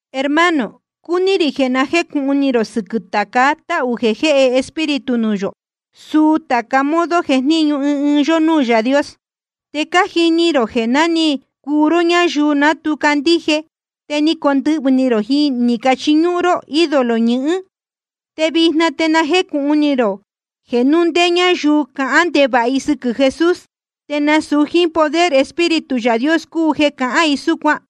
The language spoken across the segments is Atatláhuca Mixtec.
Hermano, cúní rī jeē na jécūhun ni rō sɨquɨ̄ tāca táhū jeē jéhe Espíritu nuū yō, suu tāca modo jejníñu ɨɨn ɨɨn yó núū Yaā Dios. Te cájini rō jeē ná ni cuu ró ñáyuu ná tu candíje, te ni cacondɨhvɨ̄ ni rō ni cachiñúhún ró ídolo ñɨhɨ́n. Te vijna te na jécūhun ni rō jeē núu ndé ñáyuu cahán ndevāha i sɨquɨ̄ Jesús, te nasūu jíín poder Espíritu Yaā Dios cúu jeē cahán i súcuan.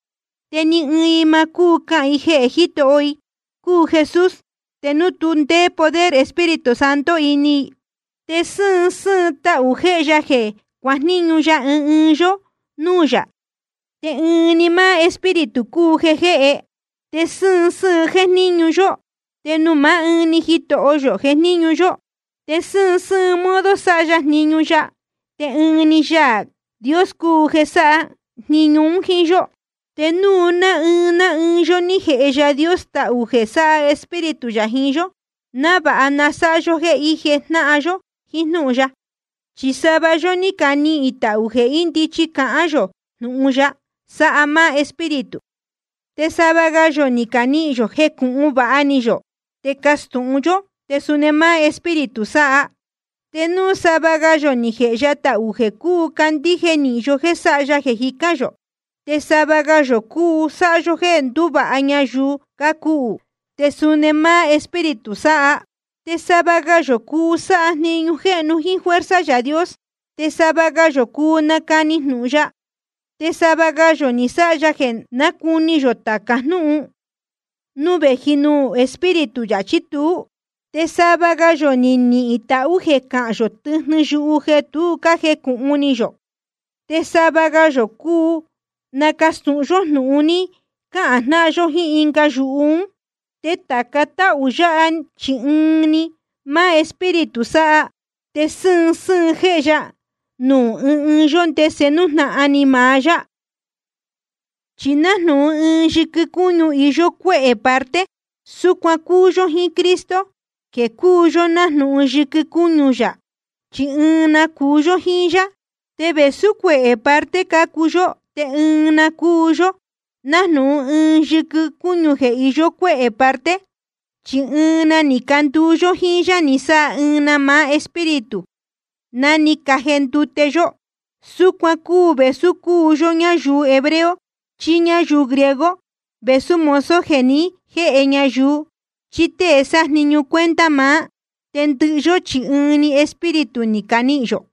Te ni ɨɨn i ma cúu cahān i jeē Jitoho i cúu Jesús, te núu tu ndéé poder Espíritu Santo ini i. Te sɨ́ɨn sɨ́ɨn tahū jéhe ya jeē cuajníñu ɨɨn ɨɨn yó núū yā, te ɨɨn‑ni máá Espíritu cúu jeē jéhe. Te sɨ́ɨn sɨ́ɨn jéjníñu yó, te nuū maá ɨɨn‑ni Jitoho yō jejníñu yó. Te sɨ́ɨn sɨ́ɨn modo sáha yó jniñu ya, te ɨɨn‑ni Yaā Dios cúu jeē sáha jniñu un jíín yó. Te nuū ná ɨɨn ná ɨɨn yó ní jēhe Yaā Dios tahū jeē sáha Espíritu yā jiín yó, návāha na sáha yó jéē ije jnáhan yó jiín jnúhun ya. Chi sava yó ní canihīn tahū jeē ndichí cáhán yō jnūhun ya, sáha máá Espíritu. Te sava ga yō ni canihīn yō jeē cúu jécūhun vāha ni yō te castūhun yó, te suni máá Espíritu sáha. Te nuū sava ga yō ni jēhe ya tahū jeē cúu cándíje nīhin yó jéē sáha ya jeē jicán yō, te sava ga yō cúu sáha yó jéē ndúvāha ñayuu cácuhū, te suni máá Espíritu sáha. Te sava ga yō cúu sáha jniñu jéhnu jíín fuerza Yaā Dios. Te sava ga yō cúu nácani jnūhun ya. Te sava ga yō ni sáha ya jeē nácuni yō tāca jnúhun, núu vēji nuū Espíritu yā chí tuú. Te sava ga yō ni nihīn tahū jeē cahán yō tɨjnɨ yuhu jeē tu jécūhun ni yō. Te sava ga yō cúu nacastūhun yó jnūhun ni cahān jnáhan yó jíín ɨnga yuhu ún. Te tāca táhū yáha, chi ɨɨn‑ni máá Espíritu sája, te sɨ́ɨn sɨ́ɨn jéhe ya nuū ɨɨn ɨɨn yó, ndese nújnahan ni maá yá. Chi nájnūhun ɨɨn yɨquɨ cúñu iyó cuéhē parte, súcuan cúu yó jíín Cristo jeē cúu yó nájnūhun yɨquɨ cúñu yā, chi ɨɨn na cúu yó jíín yá. Te vēsú cuehē parte cácuu yó te ɨɨn‑ni cúu yó, nájnūhun ɨɨn yɨquɨ cúñu jeē iyó cuéhē parte. Chi ɨɨn na ni canduu yó jíín yá ni sáha ɨɨn‑ni máá Espíritu ná ni cajendute yó. Súcuan cúu vēsú cúu yó ñáyuu hebreo chí ñáyuu griego, vēsú mozo jeē ní jeen ñayuu chí tée sájniñu cuenta maá. Te ndɨhɨ yó chi ɨɨn‑ni Espíritu ni canihīn yō.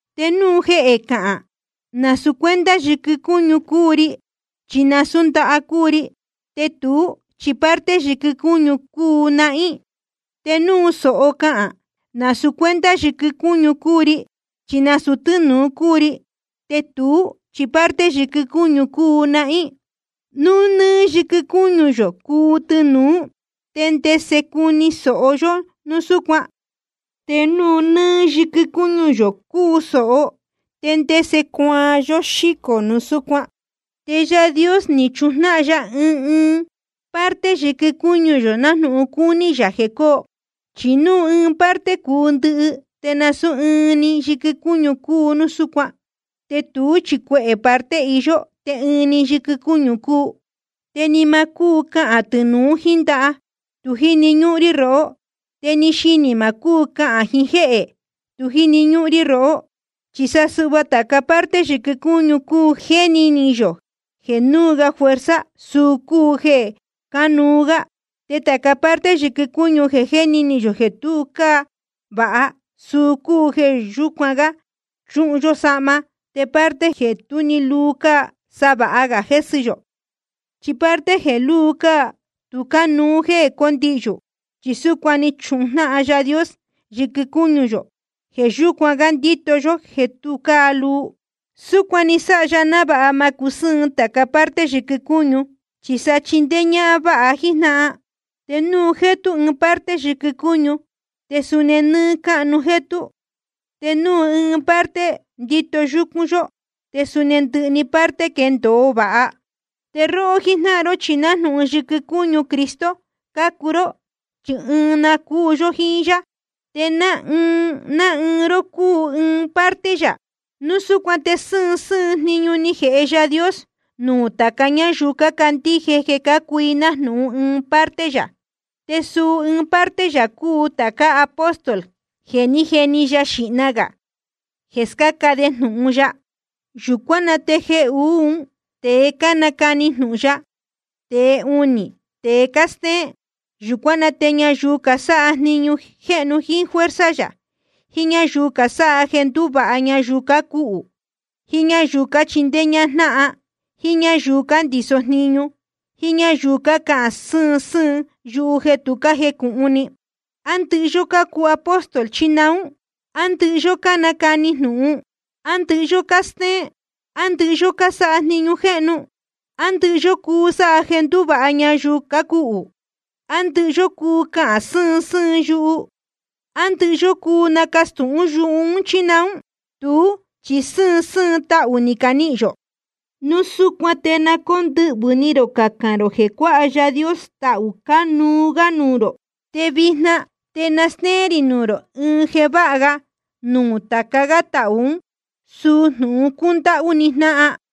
Te núu jehē cahān: Nasūu cuenta yɨquɨ cúñu cúu ri, chi nasūú ndaha cúu ri, te tuú chi parte yɨquɨ cúñu cúu nahín. Te núu sōho cahān: Nasūu cuenta yɨquɨ cúñu cúu ri, chi nasūu tɨ́nūu cúu ri, te tuú chi parte yɨquɨ cúñu cúu nahín. Núu nɨ́ɨ́ yɨquɨ cúñu yō cúu tɨnūú, ¿te ndese cuni sōho yó núu súcuan? Te núu nɨ́ɨ́ yɨquɨ cúñu yō cúu sōho, ¿te ndese cuaan yó xícō núu súcuan? Te Yaā Dios ni chujnáhan ya ɨɨn ɨɨn parte yɨquɨ cúñu, nájnūhun cúní yā jeē coo. Chi núu ɨɨn‑ni parte cúu ndɨhɨ, te nasūú ɨɨn nɨ́ɨ́ yɨquɨ cúñu cúu núu súcuan. Te tuú chi cuehē parte iyó, te ɨɨn‑ni yɨquɨ cúñu cúu. Te ni ma cúu cahān tɨnūu jíín ndaha: Tu jíni ñúhún rí rohó. Te ni xinī ma cúu cahān jiín jéhē: Tu jíni ñúhún rí rohó. Chi sa suhva tāca parte yɨquɨ cúñu jeē jéni ni yō jeē núu ga fuerza, suu cúu jeē cánuú gá. Te tāca parte yɨquɨ cúñu jeē jéni ni yō jeē tu cáa vāha, suu cúu jeē yucún gá chúhun yó sahma. Te parte jeē tú‑ni luu cáa, sa vāha ga jésɨ yō. Chi parte jeē lúu cáa, tu cánuú jéē condihyū. Chi súcuan ni chujnáhan Yaā Dios yɨquɨ cúñu, jeē yucún gá ndíto yó jéē tu cáa luu. Súcuan ni sáha ya návāha ma cusɨ́ɨn tāca parte yɨquɨ cúñu, chi sa chindéé ñájnáhan vāha jíín jnáhan. Te núu jétú ɨɨn parte yɨquɨ cúñu, te suni nɨ́ɨ́ cáhnu‑ni jétú. Te núu ɨɨn parte ndíto yúcún yó, te suni ndɨhɨ‑ni parte quéndōo vāha. Te róhó jíjnáhan ró chi nájnūhun yɨquɨ cúñu Cristo cácuu ró, chi ɨɨn na cúu yó jíín yá. Te ná ɨɨn ná ɨɨn ró cúu ɨɨn ɨɨn parte yā. Núu súcuan te sɨ́ɨn sɨ́ɨn jniñu ni jēhe Yaā Dios nuū tāca ñáyuu cácandíje jeē cácuu i nájnūhun ɨɨn ɨɨn parte yā: Te suu ɨɨn parte yā cúu tācá apóstol jeē ní jeni ya xīhna gā jeē scáca de jnūhun ya. Yūcuán na te jeē uú, tēe cánacani jnūhun ya, te jeē uní, tēe cástéén. Yūcuán na te ñayuu casáha jniñu jéhnu jíín fuerza yā, jiín ñáyuu casáha jeē ndúvāha ñayuu cácuhū, jíín ñáyuu cachíndéé ñájnáhan, jíín ñáyuu cándiso jníñu, jíín ñáyuu cácahān sɨ́ɨn sɨ́ɨn yuhu jeē tu cájecūhun ni. ¿A ndɨhɨ yó cácuu apóstol, chí naún? ¿A ndɨhɨ yó cánacani jnūhun? ¿A ndɨhɨ yó cástéén? ¿A ndɨhɨ yó cuu sáha jniñu jéhnu? ¿A ndɨhɨ yó cuu sáha jeē ndúvāha ñayuu cácuhū? ¿A ndɨhɨ yó cuu cahān sɨ́ɨn sɨ́ɨn yuhu? ¿A ndɨhɨ yó cuu nacastūhún yuhu ún, chí naún? Tuú chi sɨ́ɨn sɨ́ɨn tahū ni canihīn yō. Núu súcuan te na cóndɨhvɨ̄ ni rō cacān rō jeē cuáha Yaā Dios tahū cánuú gá nuū rō. Te vijna te na stéén rī nuū rō ɨɨn jeē váha ga nuū tāca gá tahū ún, suu jnūhun cúndáhú ni jnáhan.